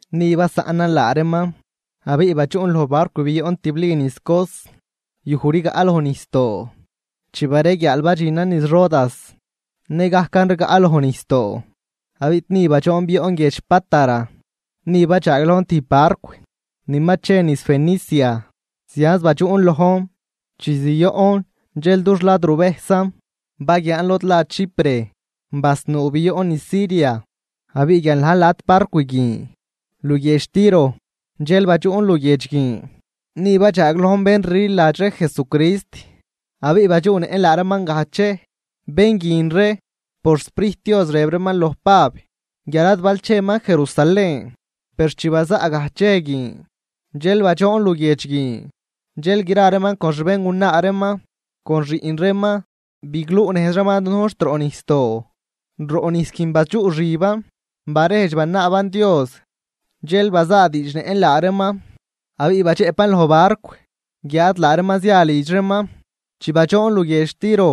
Ni basaꞌnan laa reeman, abiꞌ badxuꞌn loj barcw bioꞌn tibli niz Cos, yuj rigaꞌ loj nijsdoo. Chi bareguiaal badxinan niz Rodas nëgajcan rigaꞌ loj nijsdoo, abiꞌ ni badxoon bioꞌn guiedx Pátara. Ni badxaaglojn tijb barcw ni ma che niz Fenicia zianz badxuꞌn lojn. Chi zioꞌn dxel dux lad ruvejsan baguiaan lod la Chipre, basnuu bioꞌn niz Siria. Abiꞌ guial na̱j lat barcw guin luguiedx Tiro dxel badxuꞌn luguiedx guin. Ni badxaaglojn bén rliladx ree Jesucrist abiꞌ badxuꞌnëꞌn laa reeman gajdx dxej. Bén guin ree por xSprijt Dios rëb reeman loj Pab guial ad bal cheman Jerusalén. Per chi bazaꞌ gajdx dxej guin, dxel badxoon luguiedx guin, dxel gra reeman con xbéngunaa reeman con xiꞌn reeman, bigluꞌnejz reeman dunujn xt roꞌ nijsdoo. Roꞌ nijs guin badxuꞌxiban barejdx banaaban Dios. Dxel bazaadiidxnëꞌn laa reeman abiꞌ badxëꞌpan loj barcw guiáad laa reeman zia lidx reeman. Chi badxoon luguiedx Tiro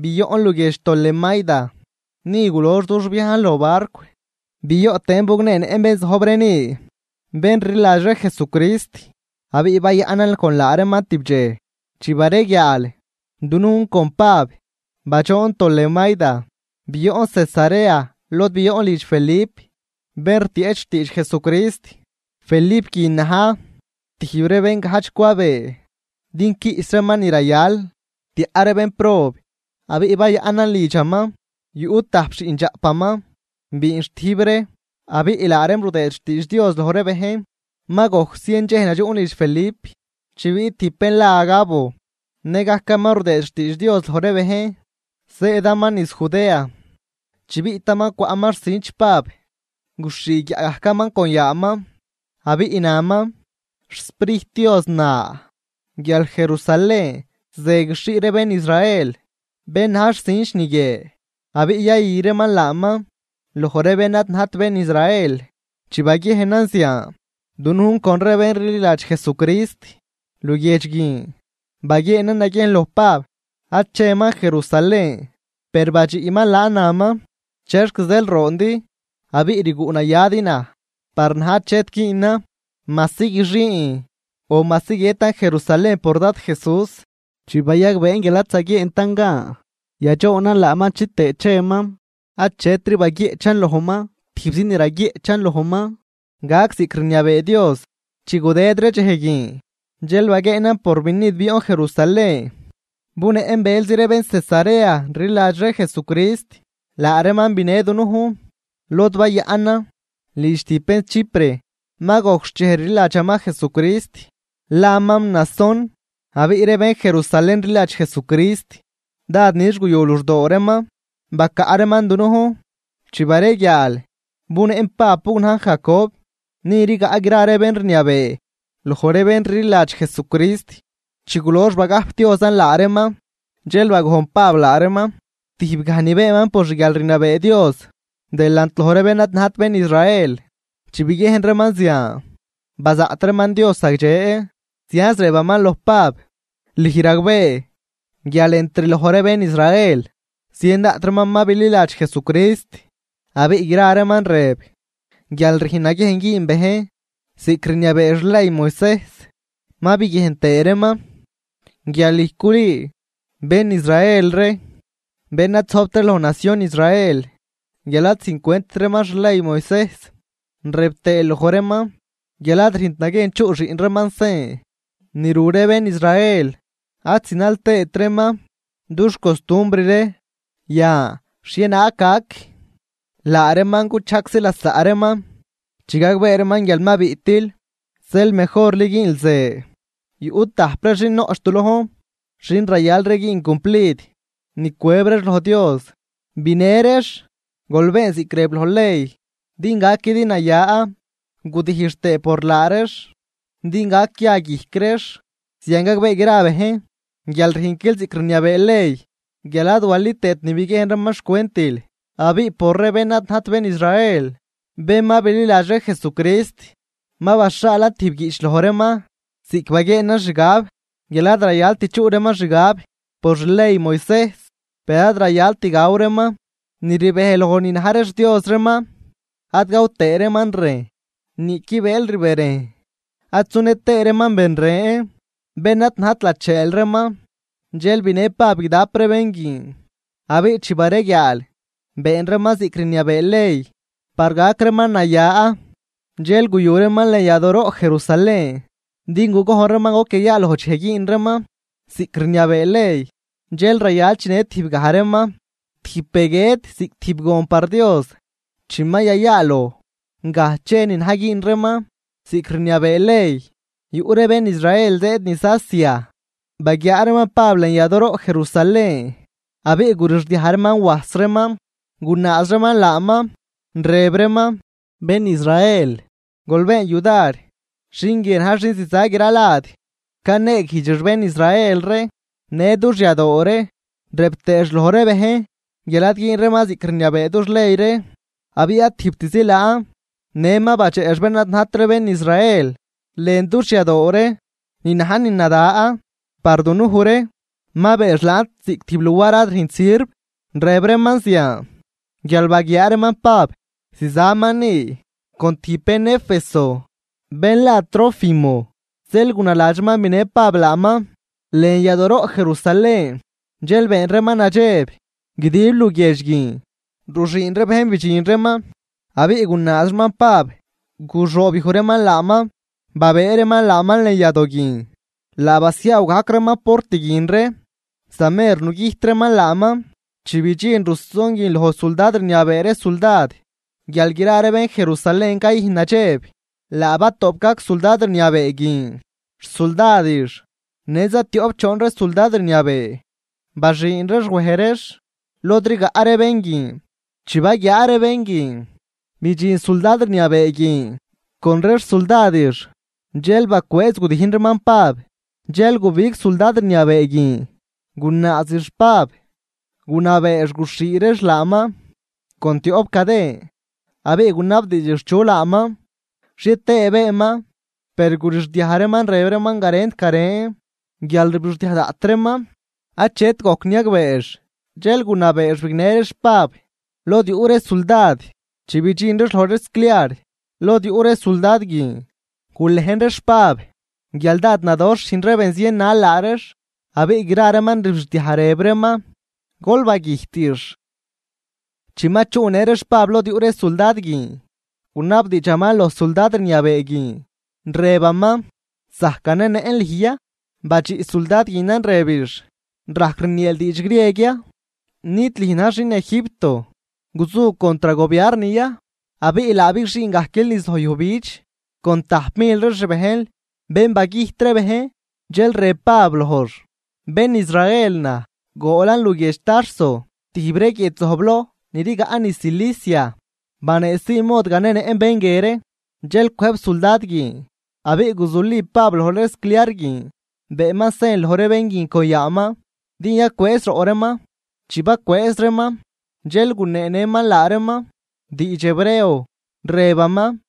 bioꞌn luguiedx Tolemaida, ni gulox dux viajn loj barcw, bioꞌ tëën bugneenëꞌn bén zojb ree ni, bén rliladx ree Jesucrist abiꞌ bayaꞌnan con laa reeman tib dxej. Chi bareguiaal, dunujn con Pab badxoon Tolemaida bioꞌn Cesarea lod bioꞌn lidx Felip, bén rtieꞌch xtiidx Jesucrist. Felip guin na̱j tijb ree bén gajdx cwabee din quiꞌs reeman ni rayal tiaꞌ ree bénprob abiꞌ bayaꞌnan lidxaman. Yuꞌ tajp xiꞌndxaꞌpaman biinxtijb ree abiꞌ laa reem rudëëd xtiidx Dios loj ree bejn. Ma gojc zien dxej nadxuꞌn lidx Felip, chi biꞌt tijb bén la Agabo nëgajcaman rudëëd xtiidx Dios loj ree bejn, zëëdaman niz Judea. Chi biꞌtaman cwaꞌman xcinch Pab guxhii guiaꞌ gajcaman con yaaman, abiꞌ naman: ―XSprijt Dios na guial Jerusalén ze guixhii ree bén Israel bén na̱j xcinch ni guie, abiꞌ yayü reeman laaman loj ree bén ad najt bén Israel. Chi baguiejnan zian, dunujn con ree bén rliladx Jesucrist luguiedx guin baguieenan naguiejn loj Pab ad cheman Jerusalén. Per badxiꞌman laan, naman: ―¿Chexc zeel roondi abiꞌ rguꞌ nayadi naj? Par naj achet güünan majsi guixiin o majsi guiëtan Jerusalén por Dad Jesús. Chi bayagbeen guial ad zaguieentan gan yadxoonan laaman chitëë cheman, achetri baguieꞌchan lojman, tijbzi ni raguieꞌchan lojman: ―Gac ziꞌc rniabee Dios. Chi gudëd ree dxej guin dxel baguieenan purvinid bioꞌn Jerusalén. Bunëꞌn bëlzi ree bén Cesarea rliladx ree Jesucrist, laa reeman binë dunujn lod bayaꞌnan lidx tijb bén Chipre, ma gojc xchej rliladxaman Jesucrist, laman Mnasón. Abiꞌ ree bén Jerusalén rliladx Jesucrist dád nix guyu luxdoo reeman bacaꞌ reeman dunujn. Chi bareguiaal bunëꞌn Pab bugnajn Jacob, ni rigaꞌ gra ree bén rniabee loj ree bén rliladx Jesucrist. Chi gulox bagajpdiozan laa reeman, dxel bagojn Pab laa reeman tijb gaj ni beenman por xguialrniabee Dios delant loj ree bén ad najt bén Israel. Chi biguiejn reeman zian, bazaꞌt reeman Dios zagdxe, zianz rëb reeman loj Pab: ―Lüj ragbee guial entr loj ree bén Israel zien daꞌt reeman ma bililadx Jesucrist, abiꞌ gra reeman rëb guial rüjn naguiejn güün bejn ziꞌc rniabee xley Moisejs. Ma biguiejn tëë reeman guial lüj culüü bén Israel ree, bén ad zojbt ree loj nacion Israel guial ad züjncwentt reeman xley Moisejs, rëb tëël loj reeman guial ad rüjnt naguiejn chuꞌ xiꞌn reeman sen ru ree bén Israel ad zinal tëët reeman dux costumbr ree. Yan, ¿xhienaag gac? Laa reeman guchajgczi lasaꞌ reeman chi gagbee reeman guial ma biꞌtil. Zeel mejorli güünl ze: Yuꞌ tajp ree xin noꞌch du lojn xin rayal ree güün cumplid ni cwëb reex loj Dios. Binë reex, gol been ziꞌc rëb loj ley din gaquidi naya, gudijx tëë por laa reex din gac ya guijc reex. Zian gagbee gra bejn guial rüjnquil ziꞌc rniabee ley, guial ad wali tëët ni biguiejn reeman xcwentil. Abiꞌ por ree bén ad najt bén Israel, bén ma bililadx ree Jesucrist, ma baxhaalan tijb guiꞌch loj reeman ziꞌc baguieenan xgab guial ad rayalt chuꞌ reeman xgab por xley Moisejs. Per ad rayalt gaw reeman ni rbej loj ni na̱j ree xdios reeman, ad gaw tëë reeman rejn niꞌqui bëël rberejn, ad sunë tëë reeman ben ren bén ad najt lacheel reeman. Dxel binë Pab guidap ree bén guin, abiꞌ chi bareguiaal been reeman ziꞌc rniabee ley par gac reeman naya. Dxel guyu reeman lën yadooroꞌ Jerusalén din gugojn reeman goc yayaaloj dxej güün reeman ziꞌc rniabee ley, dxej rayal chinë tijb gaj reeman tijb be guiët ziꞌc tijb gon par Dios. Chi ma yayaaloj gajdx dxej ni na̱j güün reeman ziꞌc rniabee ley, yuꞌ ree bén Israel zëëd niz Asia, baguiaa reeman Pab lën yadooroꞌ Jerusalén abiꞌ gurixdiaj reeman wajs reeman, gunaaz reeman laaman, rëb reeman: ―¡Bén Israel, gol been yudar! Xin guie na̱j xin ziza gra lad caneeguijdxix bén Israel ree në dux yadoo ree, rëb tëëx loj ree bejn guial ad güün reeman ziꞌc rniabee dux ley ree. Abiꞌ ad tijbtzi laan, në ma badxeꞌx bén ad najt ree bén Israel lën dux yadoo ree ni na̱j ni nada par dunuj ree ma beenx laan ziꞌc tijb luar ad rüjnt sirv. Rëb reeman zian guial baguiaa reeman Pab zizaman ni con tijb bén Éfeso bén la Trófimo, zeel gunaladx reeman binë Pab laaman lën yadooroꞌ Jerusalén. Dxel been reeman nadxeb guidib luguiedx guin, ruxüün ree bejn bidxin reeman. Abiꞌ gunaaz reeman Pab, guxoobyuj reeman laaman babëë reeman laaman lën yadoo guin laa basiaaw gajc reeman port guin ree. Za mer nugüjt reeman laaman, chi bidxin ruson guin loj suldad rniabee ree suldad guial gra ree bén Jerusalén cayüjn nadxeb. Laa batoꞌp gajc suldad rniabee guin xsuldadix në za tioꞌp choon ree suldad rniabee, baxüün reex wej reex lod rigaꞌ ree bén guin. Chi baguiaa ree bén guin bidxin suldad rniabee guin con ree xsuldadix, dxel bacwëëz gudijn reeman Pab. Dxel gubig suldad rniabee guin, gunaazix Pab gunabeex guxhii reex laaman con tioꞌp caden. Abiꞌ gunabdiidxix chu laaman xhie tëë beenman. Per gurixdiaj reeman rëb reeman garent garen, guial rbixdiaj daꞌt reeman achet gojc niagbeex, dxel gunabeex bignë reex Pab lod yuꞌ ree suldad. Chi bidxin reex loj ree scliar lod yuꞌ ree suldad guin, gulejn reex Pab guial dád nadoxh rüjn ree bén zien nal laa reex, abiꞌ gra reeman rbixdiaj, rëb reeman: ―¡Gol bagüjtix! Chi ma chuꞌnë reex Pab lod yuꞌ ree suldad guin, gunabdiidxaman loj suldad rniabee guin, rëbaman: ―¿Zajc ganenëꞌn lüj ya? Badxiꞌ suldad guinan rëbix: ―¿Rajc rnieel diidx grieg ya? ¿Nid lüj na̱j xin Egipto guzu contr gobiarn ya, abiꞌ laa bigxüün gajquil niz loj yujbidx con tajp mil ree xbejnl, bén bagüjt ree bejn? Dxel rëb Pab lojx: ―Bén Israel naj. Goolan luguiedx Tarso tijb ree guiedx zojbloj ni rigaꞌ niz Cilicia. Baneesii mod ganenëꞌn bén guie ree. Dxel cwëjb suldad guin, abiꞌ guzuli Pab loj ree scliar guin beenman sen loj ree bén guin con yaaman din yacwëëz roꞌ reeman. Chi bacwëëz reeman, dxel guneenëman laa reeman diidx hebreo, rëbaman: